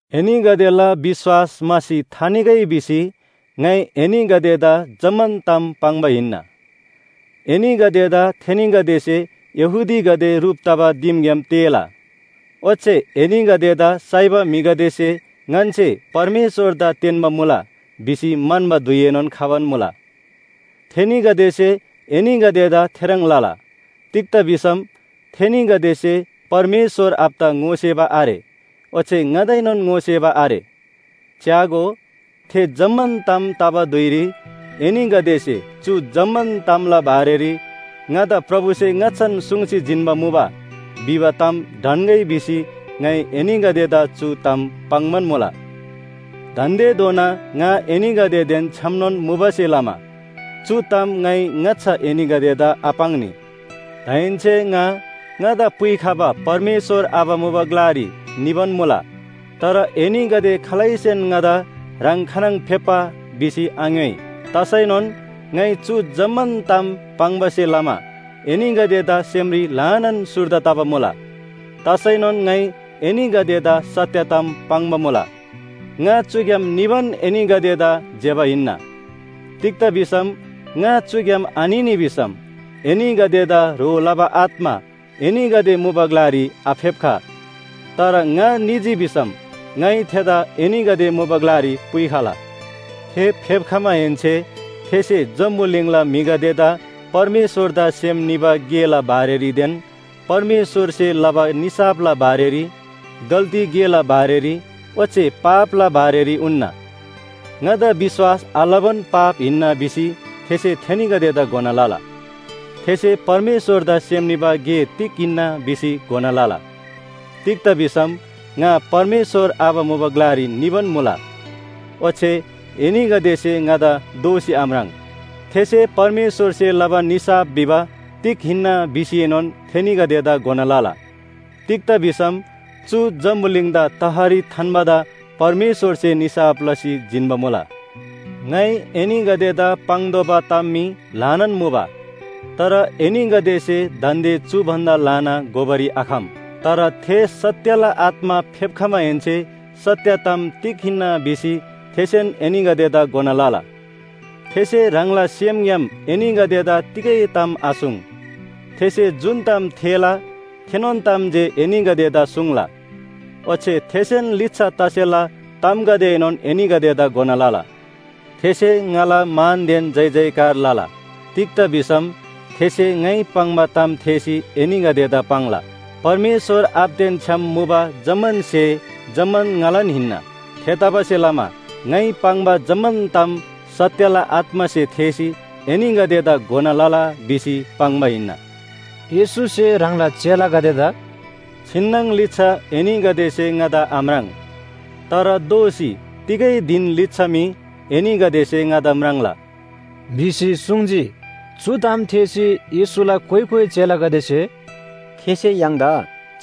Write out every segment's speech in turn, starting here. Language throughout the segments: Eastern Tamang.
“एनीगदेला विश्‍वास म्‍हासी थानिगै भिसी ङाइ एनीगदेदा जम्‍मान ताम पाङ्बा हिन्‍ना। एनीगदेदा थेनीगदेसे यहूदीगदे ह्रुप तबा दिमग्‍याम तेःला। ओच्‍छे एनीगदेदा साइबा म्‍हिगदेसे ‘ङन्‍से परमेश्‍वरदा तेन्‍बा मुला’ भिसी म्‍हन्‍बा धुइएनोन खबान मुला। थेनीगदेसे एनीगदेदा थेह्रङ् लला, तिग्‍दा भिसम थेनीगदेसे परमेश्‍वर आबादा ङोसेबा आरे ओच्‍छे ङादाएनोन ङोसेबा आरे। च्‍यागो, थे जम्‍मान ताम तबा धुइरी एनीगदेसे ‘चु जम्‍मान तामला बारेरी ङादा प्रभुसे ङाच्‍छान सुङ्सी जिन्‍बा मुबा’ भिबा ताम ढन्‍गै भिसी ङाइ एनीगदेदा चु ताम पाङ्‌बान मुला। दान्‍देधोना ङा एनीगदेदेन छ्‌यामनोन मुबासे लमा चु ताम ङाइ ङाच्‍छा एनीगदेदा आपाङ्नी। दाहेन्‍से ङा ङादा पुइखबा परमेश्‍वर आबा मुबा ग्‍लारी निबान मुला। तर एनीगदे खालैसेन ङादा ‘ह्राङ खानङ फेप्‍बा?’ भिसी आङ्‍योइ। तसैनोन ङाइ चु जम्‍मान ताम पाङ्बासे लमा एनीगदेदा सेमरी ल्‍हानान सुर्दा तबा मुला। तसैनोन ङाइ एनीगदेदा सत्‍य ताम पाङ्बा मुला, ङा चुग्‍याम निबान एनीगदेदा ज्‍यबा हिन्‍ना। तिग्‍दा भिसम ङा चुग्‍याम आनिनी भिसम एनीगदेदा ह्रो लबा आत्‍मा एनीगदे मुबा ग्‍लारी आफेप्‍ख। तर ङा निजी भिसम ङाइ थेदा एनीगदे मुबा ग्‍लारी पुइखला। थे फेप्‍खमाहेन्‍से थेसे जम्‍बुलिङला म्‍हिगदेदा परमेश्‍वरदा सेम निबा गेला बारेरीदेन परमेश्‍वरसे लबा निसाफला बारेरी, गल्‍ती गेला बारेरी ओच्‍छे पापला बारेरी उन्‍ना। ङादा विश्‍वास आलबान पाप हिन्‍ना भिसी थेसे थेनीगदेदा घोना लला। थेसे परमेश्‍वरदा सेम निबा गे तिग हिन्‍ना भिसी घोना लला। तिग्‍दा भिसम ङा परमेश्‍वर आबा मुबा ग्‍लारी निबान मुला, ओच्‍छे एनीगदेसे ङादा दोःसी आम्राङ्। थेसे परमेश्‍वरसे लबा निसाफ भिबा तिग हिन्‍ना भिसीएनोन थेनीगदेदा घोना लला। तिग्‍दा भिसम चु जम्‍बुलिङदा तहरी थान्‍बादा परमेश्‍वरसे निसाफ लसी जिन्‍बा मुला। “ङाइ एनीगदेदा पाङ्तोःबा ताम मी ल्‍हानान मुबा। तर एनीगदेसे दान्‍दे चु भन्‍दा ल्‍हाना घोबारी आखम। तर थे सत्‍यला आत्‍मा फेप्‍खमाहेन्‍से सत्‍य ताम तिग हिन्‍ना भिसी थेसेन एनीगदेदा घोना लला। थेसे ह्राङला सेमग्‍याम एनीगदेदा तिगै ताम आसुङ्, थेसे जुन ताम थेःला थेनोन ताम जे एनीगदेदा सुङ्ला। ओच्‍छे थेसेन लिच्‍छा तसेला तामगदेएनोन एनीगदेदा घोना लला। थेसे ङाला मानदेन जयजयकार लला, तिग्‍दा भिसम थेसे ङाइ पाङ्बा ताम थेःसी एनीगदेदा पाङ्ला। परमेश्‍वर आबादेन छ्‌याम मुबा जम्‍मान स्‍हे जम्‍मान ङालान हिन्‍ना। थेतबासेलमा ङाइ पाङ्बा जम्‍मान ताम ‘सत्‍यला आत्‍मासे थेःसी एनीगदेदा घोना लला’ भिसी पाङ्बा हिन्‍ना।” येशूसे ह्राङला चेलागदेदा “छिन्‍नङ लिच्‍छा एनीगदेसे ङादा आम्राङ्, तर दोःसी तिगै धिन लिच्‍छा मी एनीगदेसे ङादा म्राङ्ला” भिसी सुङ्जी। चु ताम थेःसी येशूला कोइ कोइ चेलागदेसे “थेसे य्‍हाङदा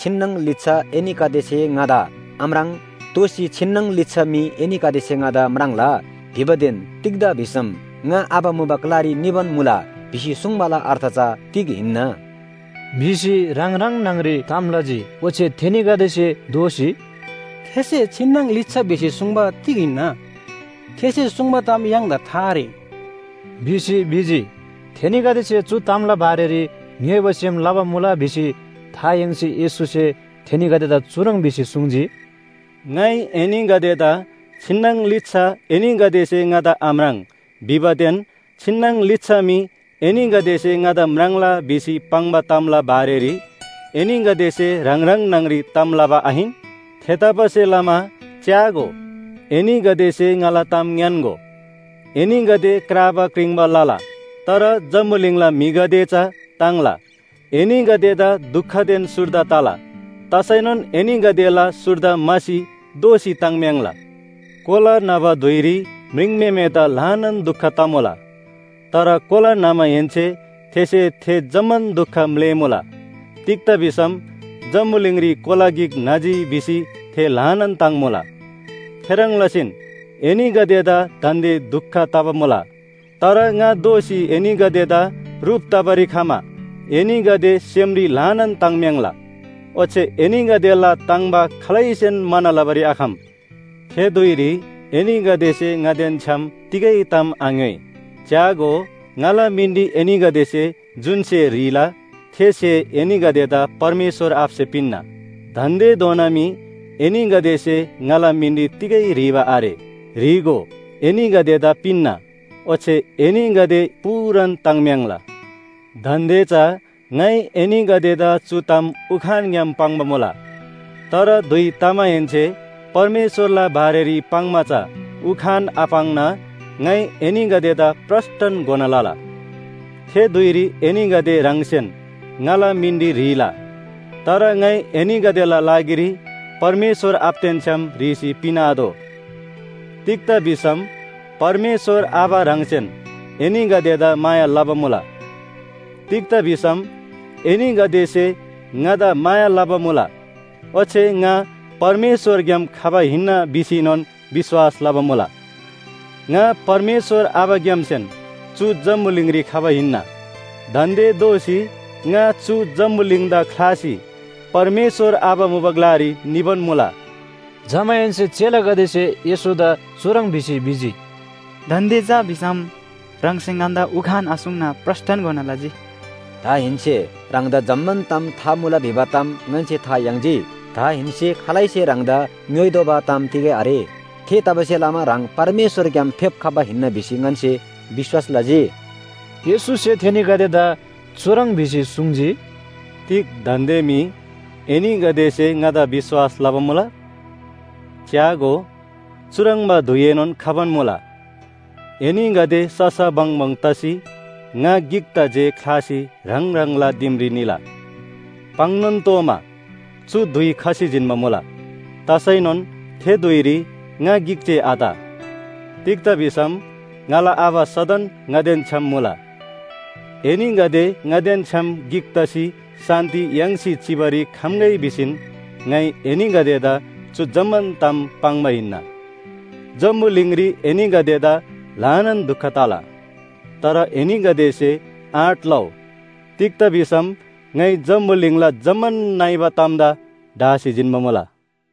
‘छिन्‍नङ लिच्‍छा एनीगदेसे ङादा आम्राङ् दोःसी छिन्‍नङ लिच्‍छा मी एनीगदेसे ङादा म्राङ्ला’ भिबादेन ‘तिग्‍दा भिसम ङा आबा मुबा ग्‍लारी निबान मुला’ भिसी सुङ्बाला अर्थ चा तिग हिन्‍ना?” भिसी ह्राङ ह्राङ न्‍हङ‍री ताम लजी। ओच्‍छे थेनीगदेसे दोःसी, “थेसे ‘छिन्‍नङ लिच्‍छा’ भिसी सुङ्बा तिग हिन्‍ना? थेसे सुङ्बा ताम य्‍हाङदा था आरे” भिसी भिजी। थेनीगदेसे चु तामला बारेरी ङ्‌योइबा सेम लबा मुला भिसी था याङ्सी येशूसे थेनीगदेदा चुह्रङ् भिसी सुङ्जी, “ङाइ एनीगदेदा ‘छिन्‍नङ लिच्‍छा एनीगदेसे ङादा आम्राङ् भिबादेन छिन्‍नङ लिच्‍छा मी एनीगदेसे ङादा म्राङ्ला’ भिसी पाङ्बा तामला बारेरी एनीगदेसे ह्राङ ह्राङ न्‍हङ‍री ताम लबा आहिन? थेतबासेलमा च्‍यागो, एनीगदेसे ङाला ताम ङ्‌यान्‍गो, एनीगदे क्राबा क्रिङ्बा लला, तर जम्‍बुलिङला म्‍हिगदे चा ताङ्ला। एनीगदेदा दुखदेन सुर्दा तला, तसैनोन एनीगदेला सुर्दा म्‍हासी दोःसी ताङ्म्‍याङ्ला। कोला न्‍हबा धुइरी म्रिङम्‍हेमेदा ल्‍हानान दुख तमुला। तर कोला न्‍हमाहेन्‍से थेसे थे जम्‍मान दुख म्‍लेःमुला। तिग्‍दा भिसम जम्‍बुलिङरी कोला गिक न्‍हजी भिसी थे ल्‍हानान ताङ्मुला। थेह्रङ् लसीन एनीगदेदा दान्‍दे दुख तबा मुला। तर ङा दोःसी एनीगदेदा ह्रुप तबारी खमा एनीगदे सेमरी ल्‍हानान ताङ्म्‍याङ्ला। ओच्‍छे एनीगदेला ताङ्‍बा खालैसेन म्‍हाना लबारी आखम। थे धुइरी एनीगदेसे ङादेन छ्‌याम तिगै ताम आङ्‍योइ। च्‍यागो, ङाला मिनरी एनीगदेसे जुन स्‍हे ह्रीला थे स्‍हे एनीगदेदा परमेश्‍वर आबासे पिन्‍ना। दान्‍देधोना मी एनीगदेसे ङाला मिनरी तिगै ह्रीबा आरे। ह्री‍गो एनीगदेदा पिन्‍ना, ओच्‍छे एनीगदे पूरान ताङ्म्‍याङ्ला। “दान्‍दे चा ङाइ एनीगदेदा चु ताम उखानग्‍याम पाङ्बा मुला, तर धुइ तमाहेन्‍से परमेश्‍वरला बारेरी पाङ्‌मा चा उखान आपाङ्ना ङाइ एनीगदेदा प्रस्‍टन घोना लला। थे धुइरी एनीगदे ह्राङसेन ङाला मिनरी ह्रीला। तर ङाइ एनीगदेला लागिरी परमेश्‍वर आबादेन छ्‌याम ह्रीसी पिन्‍आतोः। तिग्‍दा भिसम परमेश्‍वर आबा ह्राङसेन एनीगदेदा माया लबा मुला। तिग्‍दा भिसम एनीगदेसे ङादा माया लबा मुला, ओच्‍छे ङा परमेश्‍वरग्‍याम खबा हिन्‍ना भिसीएनोन विश्‍वास लबा मुला। ङा परमेश्‍वर आबाग्‍यामसेन चु जम्‍बुलिङरी खबा हिन्‍ना, दान्‍दे दोःसी ङा चु जम्‍बुलिङदा ख्‍लासी परमेश्‍वर आबा मुबा ग्‍लारी निबान मुला।” जमाहेन्‍से चेलागदेसे येशूदा चुह्रङ् भिसी भिजी, “दान्‍दे चा भिसम ह्राङसे ङन्‍दा उखान आसुङ्ना प्रस्‍टन घोना लजी। दाहेन्‍से ह्राङदा जम्‍मान ताम था मुला भिबा ताम ङन्‍से था याङ्जी। दाहेन्‍से खालैसे ह्राङदा ङ्‍योइतोःबा ताम तिगै आरे। थेतबासेलमा ह्राङ परमेश्‍वरग्‍याम फेप्‍खबा हिन्‍ना भिसी ङन्‍से विश्‍वास लजी।” येशूसे थेनीगदेदा चुह्रङ् भिसी सुङ्जी, “तिग दान्‍दे मी एनीगदेसे ङादा विश्‍वास लबा मुला? च्‍यागो, चुह्रङ्बा धुइएनोन खबान मुला, एनीगदे ससा बङबङ तसी ङा गिकदा जे ख्‍लासी ह्राङ ह्राङला दिमरी निला, पाङ्‌नोन तोःमा चु धुइ खसी जिन्‍बा मुला। तसैनोन थे धुइरी ङा गिक जे आत, तिग्‍दा भिसम ङाला आबा सदन ङादेन छ्‌याम मुला। एनीगदे ङादेन छ्‌याम गिक तसी शान्‍ति याङ्सी चिबारी खम्‍गै भिसीन ङाइ एनीगदेदा चु जम्‍मान ताम पाङ्बा हिन्‍ना। जम्‍बुलिङरी एनीगदेदा ल्‍हानान दुख तला, तर एनीगदेसे आँट लउ, तिग्‍दा भिसम ङाइ जम्‍बुलिङला जम्‍मान नइबा तामदा ढासी जिन्‍बा मुला।”